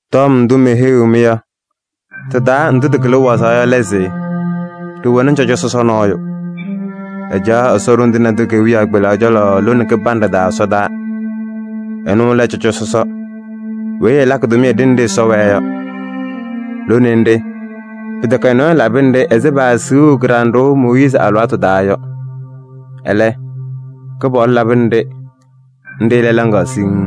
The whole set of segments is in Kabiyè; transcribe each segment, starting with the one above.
Tɔm ndʋ meheyiɣ-mɩ yɔ, tɩ-taa ndʋ tɩkɩlɩ wazaɣ yɔ lɛ se: ɖɩwɛnɩ cɔjɔ sɔsɔ nɔɔyʋ. Ɛcaɣ Ɛsɔ Ɖoŋ Tɩŋa Tʋ kewiyaɣ kpelaɣ cɔlɔ lone kɩbanɖɛ taa ɛsɔdaa. Ɛnʋ lɛ cɔjɔ sɔsɔ weyi ɛlakɩ tʋmɩyɛ ɖenɖe Ɛsɔ wɛɛ yɔ. Lone nɖɩ, pɩtɛkɛ nɔɔyʋ labɩnɩ-ɖɩ ɛzɩ paasiɣu kɩɖanɖʋʋ Mooyiizi alɩwaatʋ taa yɔ. Ɛlɛ, Kɩpaɣlʋ labɩnɩ-ɖɩ, nɖɩ lɛ laŋaɣ siŋŋ.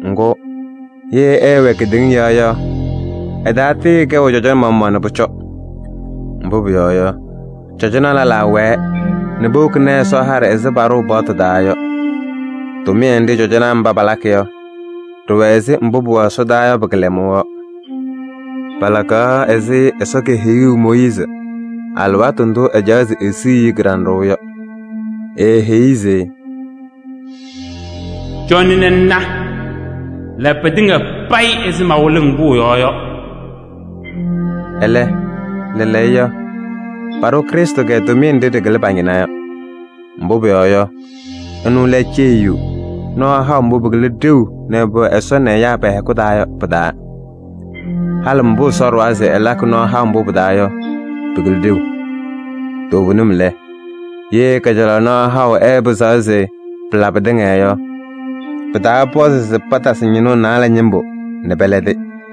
Ŋgʋ, ye ɛɛwɛ kedeŋa yɔɔ yɔ, ɛtaatɩɩkɛʋ cɔjɔ maɣmaɣ nɛ pʋcɔ. Mbʋ pʋyɔɔ yɔ, cɔjɔnaa lɛlaa wɛɛ nɛ powokini Ɛsɔ haɖɛ ɛzɩ paɖʋʋ paɣtʋ taa yɔ. Tʋmɩyɛ nɖɩ cɔjɔnaa mba palakɩ yɔ, ɖɩwɛ ɛzɩ mbʋ pʋwɛ ɛsɔdaa yɔ pɩ-kɩlɛmʋʋ yɔ. Palakaɣ ɛzɩ Ɛsɔ keheyuu Mooyiizi alɩwaatʋ ndʋ ɛcaɣaɣ se esiɣ-i kɩɖanɖʋʋ yɔ. Eeheyi-i se: “Cɔnɩ ŋna, la pɩtɩŋa payɩ ɛzɩ mawɩlʋʋ-ŋ pʋʋ yɔɔ yɔ.” Ɛlɛ lɛɛlɛɛyɔ, paɖʋ Krɩstʋ tʋmɩyɛ nɖɩ ɖɩkɩlɩ pa-ñɩna yɔ. Mbʋ pʋyɔɔ yɔ, ɛnʋ lɛ ceyiyu nɔɔ haʋ mbʋ pɩkɩlɩ ɖeu nɛ pʋwɛɛ Ɛsɔ nɛ ɛyaa pɛ-hɛkʋ taa yɔ pɩ-taa. Halɩ mbʋ Ɛsɔ ɖʋwa se ɛlakɩ nɔɔ haʋ mbʋ pɩ-taa yɔ, pɩkɩlɩ ɖeu. Toovenim lɛ, ye kajalaɣ nɔɔ haʋ ɛɛpɩzaɣ se pɩla pɩtɩŋa yɔ, pɩtaapɔzɩ se patasɩ ñɩnʋʋ naalɛ ñɩmbʋ nɛ pɛlɛdɩ.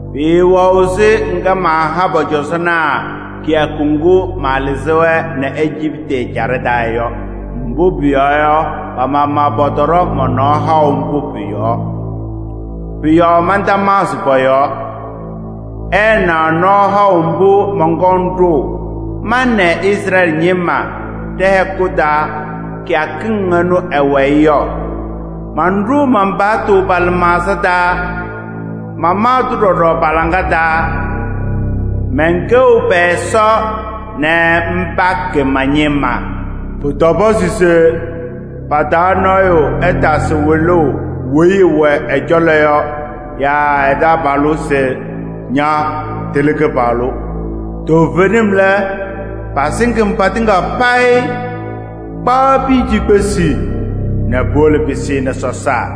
Pɩɩwɛɣ ɛzɩ ŋga maaha pɔ-cɔzɔnaa kɩyakʋ ŋgʋ malɩzɩ-wɛ nɛ Ejiptɩ ɛjaɖɛ taa yɔ. Mbʋ pʋyɔɔ yɔ, pa-maɣmaɣ pɔtɔɖɔ mɔ-nɔɔ haʋ mbʋ pʋ-yɔɔ. Pʋ-yɔɔ mantamaɣzɩ pɔ-yɔɔ. Ɩɩnaɣ nɔɔ haʋ mbʋ mɔnkɔŋ ɖʋʋ ma nɛ Izrɛɛlɩ ñɩma ɖɛ-hɛkʋ taa kɩyakɩŋ ɩnʋ ɩ-wayɩ yɔ. Manɖʋʋ man-paɣtʋ pa-lɩmaɣza taa. Mamaɣ-tʋ ɖɔɖɔ pa-laŋa taa. Mɛnkɛɣ pɛ-Ɛsɔ nɛ mba kɛ ma-ñɩma. Pʋtɔpɔzɩ se pa-taa nɔɔyʋ ɛtasɩ wɩlʋʋ weyi ɛwɛ ɛ-cɔlɔ yɔ yaa ɛ-taabalʋ se: ‘Ña, tɩlɩ Kɩpaɣlʋ!’ Toovenim lɛ, pasɩŋ-m patɩŋa payɩ, kpaɣ piya cikpesi nɛ puwolo pɩsɩnɩ sɔsaa.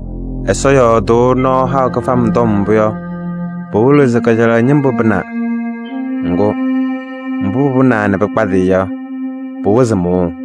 Ɛsɔ yɔɔdʋʋ nɔɔ haʋ kɩfam tɔm mbʋ yɔ, pɩwɩlɩɣ se kajalaɣ ñɩmbʋ pɩnaa. Ŋgʋ, mbʋ pɩpɩnaa nɛ pɩkpadɩyɩ yɔ, pɩwɩzɩ mʋʋʋ.